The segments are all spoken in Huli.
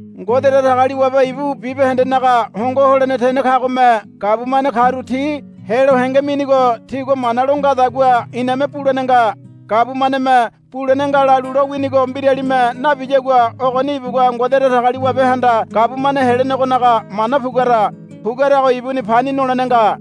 Ngode Datagaliwabe ibu bibahendenaga hongo holene tene kagome gabumane karu ti helo henge minigo tigua mana lo ngadagua iname bulene nga. Gabumaneme bulene nga lalu lowinigo mbiralime nabiyagua ogoni ibugua Ngode Datagaliwabehanda gabumane helenegonaga mana puguara. Puguarago ibuni pani nolene nga.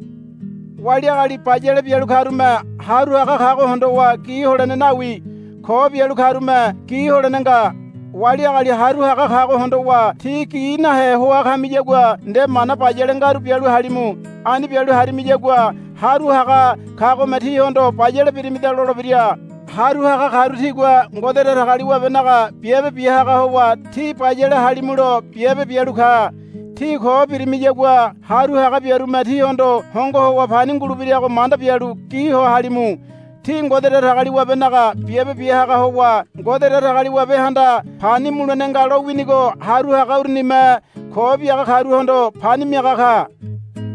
Wali agali bayale bialu karume haru haga kago hondowa gi holene nawi. Ko bialu karume gi holene nga. Wali agali haru haga kago hondowa tí gi nahe hoa kamiyagua nde mana bayale ngaru bialu halimu. Ani bialu harimiyagua haru haga kagome tíhondo, Bayale birimida, lolebira. Haru haga karu tigua Ngode Datagaliwabenaga biabe biahaga howa tí bayale halimulo biabe bialu ka. Tí ko birimiyagua haru haga biarume tíhondo hongo howa pani ngulebirago manda bialu gi ho halimu. Ti Ngode Datagaliwabenaga biabe biahaga howa Ngode Datagaliwabehanda pani mulene nga lowinigo haru haga urunime ko biaga karuhondo pani miaga ka.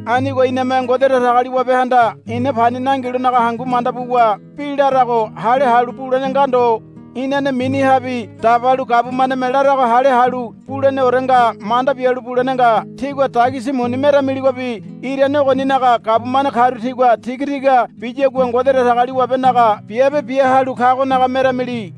Anigo iname Ngode Datagaliwabehanda ina pani nangilonaga hangu manda buwa bi larago hale halu bulene nga ndo. Inane minihabi dabalu gabumaneme larago hale halu buleneore nga manda bialu bulene nga. Tígua dagisi muni meramiligobi irane ogoninaga gabumane karu tigua tigatiga biyagua Ngode Datagaliwabenaga biabe biahalu kagonaga meramili.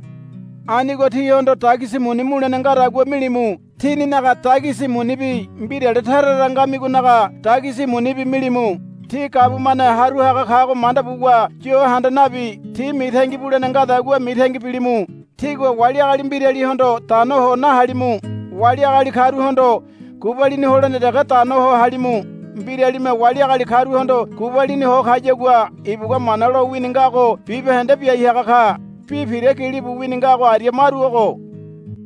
Anigo tihondo dagisi muni mulene ngadagua milimu. Tíninaga dagisi munibi mbirale tara tara ngamigonaga dagisi munibi milimu. Ti gabumane haru haga kago manda buwa yo handa nabi ti mitangi bulene ngadagua mitangi bilimu. Tígua wali agali mbiralihondo dano ho nahalimu. Wali agali karuhondo gubalini holene dege dano ho halimu. Mbiralime wali agali karuhondo gubalini ho kayagua ibugua Mana lowini ngago bibahende biai haga ka. Bi pira gilibu wini ngago aria maru ogo,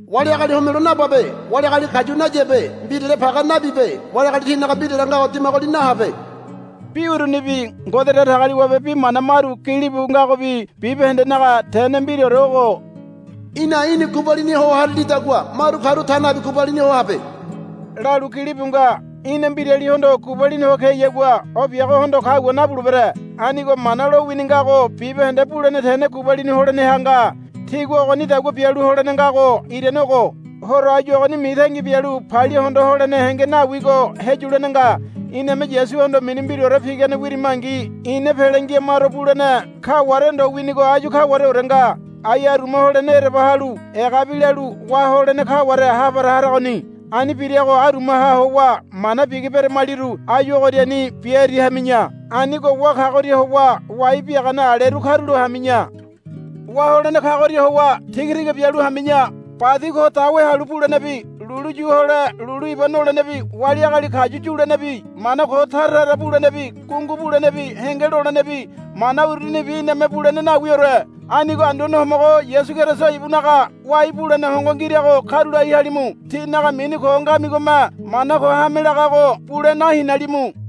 Wali agali homelo nababe. Wali agali kayu nayabe. Mbirale page nabibe. Wali agali tinaga mbirale ngago dimagoli nahabe. Bi urunibi Ngode Datagaliwabe bi mana maru gilibu ngagobi bibahendenaga tene mbiraore ogo, Í̠na í̠ni gubalini ho harilidagua maru karu ta nabi gubalini ho habe, lalu gilibu nga. Í̠na mbiralihondo gubalini ho keyagua o biagohondo kagua nabulebere. Anigo Mana lowini ngago bibahende bulene tene gubalini holeneha nga. Tígua ogonidagua bialu holene ngago irane ogo. Horo áyu ogoni mitangi bialu palia hondo holene henge nawigo heyulene nga. Iname Yasuhondo mini mbiraore pigane wirimangi ina pele ngia maro bulene kaware ndo winigo áyu kawareore nga. Ai aruma holene ereba halu egabi lalu wá holene kaware ha para haragoni. Ani birago arumaha howa mana bigi beremaliru áyu ogoriani biairi hami̱ya. Anigo wá kagoria howa wai biagane aleru karulo hami̱ya. Wá holene kagoria howa tigatiga bialu hami̱ya. Badi ko dawe halu bulenebi lulu yu hole lulu iba nolenebi wali agali kayu yulenebi mana ko tara tara bulenebi gungu bulenebi henge lolenebi mana urunibi iname bulene nawiore. Anigo Anduane Homogo Yasu Keriso ibunaga wai bulene hongo ngirago karulai halimu. tínaga mini ko ngamigome mana ko hame lagago bule nahinalimu.